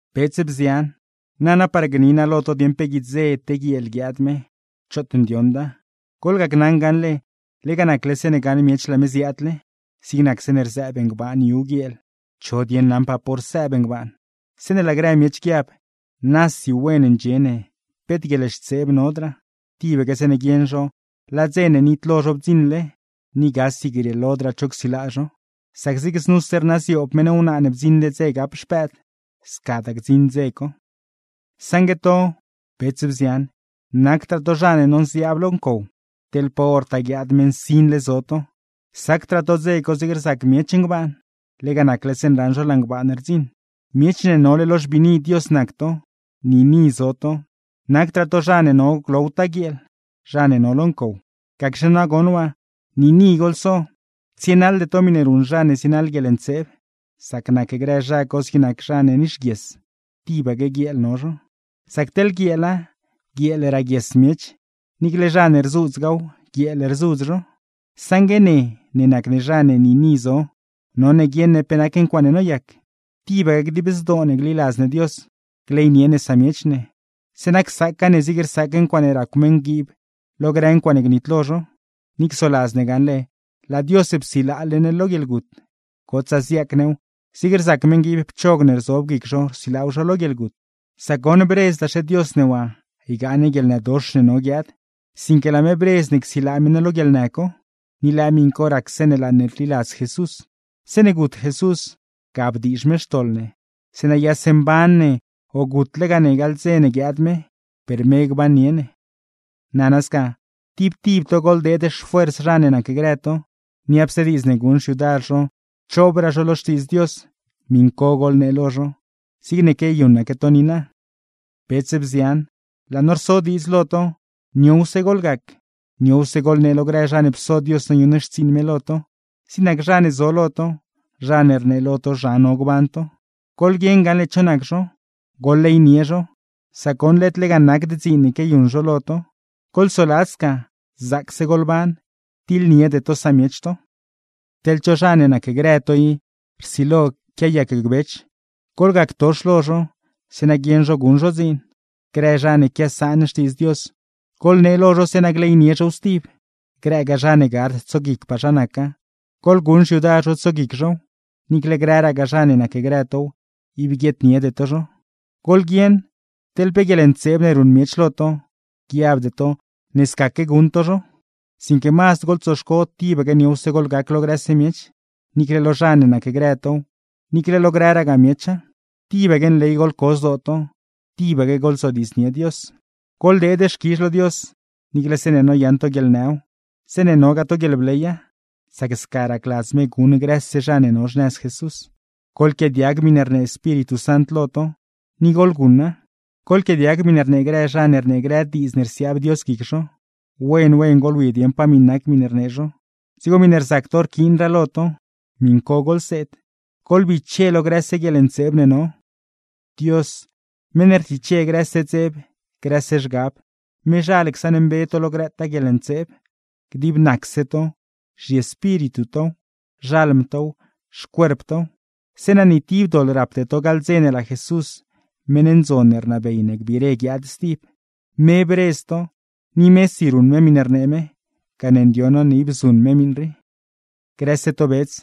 Bets, bzian, nana par gni naa lo to dieṉ pe guidze te guieel guiaad me, choot ndioṉda. Goḻgacnaṉ gaṉle, lega nacle zeeṉe gaṉ miech laa me ziaadle, zig nac zeeṉe rzëëb ngbaan yu guieel, ¿cho dieṉ naṉpaa pa hor sëëb ngbaan? Zeeṉe laa grë miech guiab: “Nasi wen ndxie ne, peet guieḻxtseeb nodraa”, tibaque zeeṉe guieṉ zho laa dze ne nitlo zho bdziṉle, ni gasi grieelodraa cho csilaa zho. Sac zig znuse rnaaz yoob meṉ wnaa ne bdziṉle dze gap xpëëd; scadaa gdziṉ dze co. Saṉgue to, bets, bzian, nacdraa to zha ne nonziaab lo ncow, teḻ pa hortaa guiaad me nsinle zo to; sacdraa to dze co zig rzac miech ngbaan, lega nacle zeeṉe raṉ zho laa ngbaan rdziṉ. Miech ne nole lo xbiini Dios nac to, niini zo to; nacdraa to zha ne no glowtaa guieel, zha ne no lo ncow; gacxe nagoṉ waa, niini goḻso, tsienaḻde to miṉe ruṉ zha ne zienaḻ guieḻntseeb; sac nac grë zha co zig nac zha ne nixguies, tibaque guieel no zho. Sac teḻ guieela, guieel raaguies miech, niicle zha ne rzuudzgaaw guieel rzudz zho. Saṉgue ne ne nac ne zha ne niini zo, none guieṉ ne pe nac ncuaaṉe noyac. Tibaque dib zdoo ne gliladz ne Dios, gleynie ne samiech ne, zeeṉa csaaca ne zig rsaac ncuaaṉe racw meṉguiib lo grë ncuaaṉe gnitlo zho; ni csoladz ne gaṉle laa Dios psilaale ne lo guieḻgut, gotsaa ziaac new zig rzac meṉguiib pchog ne rzob guic zho rsilaaw zho lo guieḻgut. Sac goṉ bredzdaxe Dios ne waa ygaa ne guieḻnëdox ne no guiaad, sinque laa me bredz ne csilaa me ne lo guieḻnë co. Ni lëë miṉ co rac zeeṉe laa ne rliladz Jesús. Zeeṉe gut Jesús, ga bdiizh me xtoḻ ne; zeeṉa yase mban ne o gutlegaa ne gaḻ dze ne guiaad me, per me gbannie ne. Nana sca, tib tib to goḻdeed xfuers zha ne nacgrë to, niapse diidz ne guṉ xyudar zho choobraa zho lo Xtiidz Dios, miṉ co goḻnee lo zho; zigne quiayuṉaque to niina. Bets, bzian, laa no rso diidz lo to: Niowse goḻgac, niowse goḻnee lo grë zha ne pso Dios noyuṉ xtsiiṉ me lo to, zig nac zha ne zo lo to, zha ne rnee lo to zha no gban to. Goḻguieṉ gaṉle cho nac zho, goḻleynie zho, sac goṉ led lega nacd dziin ne quiayuṉ zho lo to. Goḻsoladz sca: ¡Zaacse goḻban, tiḻniede to samiech to! Teḻ cho zha ne nacgrë to i, rsilo quiayacgbech, goḻgactox lo zho, zeeṉa guieṉ zho guṉ zho dziin. Grë zha ne quiasaan Xtiidz Dios, goḻnee lo zho zeeṉa gleynie zhow stib; grëgaa zha ne gard tsoguicpaa zha naca, goḻguṉ xyudar zho tsoguic zhow; niicle grëragaa zha ne nacgrë tow, ib guieedniede to zho. Goḻguieṉ teḻ pe guieḻntseeb ne ruṉ miech lo to, guiabde to ne scaque guṉ to zho; sinque mazd goḻtsoxco tibaque niowse goḻgac lo grëse miech, niicle lo zha ne nacgrë tow, niicle lo grëragaa miecha. Tibaque nley goḻco zdoo to. Tibaque goḻzodiidznie Dios. Goḻdeed xquizh lo Dios, niicle zeeṉe noyaṉ to guieḻnëw, zeeṉa nogaa to guieḻbleya, sac sca racladz me guṉ grëse zha ne no xnëz Jesús. Goḻquiaadiag miṉe rnee Espíritu Sant lo to, ni goḻguṉa. Goḻquiaadiag miṉe rnee grë zha ne rnee grë diidz ne rsiaab Dios guic zho; wen wen goḻwi dieṉ pe nac miṉe rnee zho, dzigo miṉe rzac to rquiinraa lo to, miṉ co goḻseed. Goḻbiche lo grëse guieḻntseeb ne no. Dios, meṉ ne rtiche grëse dzeb, grëse zhgab, mezhal csaṉmbe to lo grëtaa guieḻntseeb; dib nacse to (zhiespíritu tow, xalm tow, xcuerp tow) zeeṉa ni tib doḻ rapde to gaḻ dze ne laa Jesús meṉ ndzon ne rnabey ne gbiire guiaad stib. Me bredz to, ni mesi ruṉ me miṉe rnee me, gane ndioṉ no ne ib zuṉ me miṉ rii. Grëse to bets,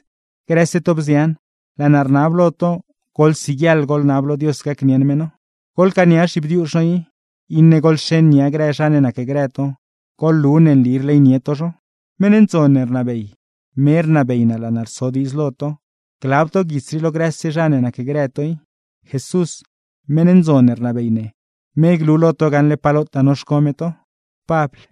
grëse to bzian, laa naa rnab lo to goḻsiguieḻ goḻnab lo Dios gacnieṉ me no. Goḻcaania zhibdiuzh no i, iṉe goḻxeṉ nia grë zha ne nacgrë to, goḻlu ne nli rleynie to zho. Meṉ ndzon ne rnabey, me rnabey naa laa naa rso diidz lo to, glab to guits rii lo grëse zha ne nacgrë to i. Jesús, meṉ ndzon ne rnabey ne, me glu lo to gaṉle pa lotaa noxco me to. Pabl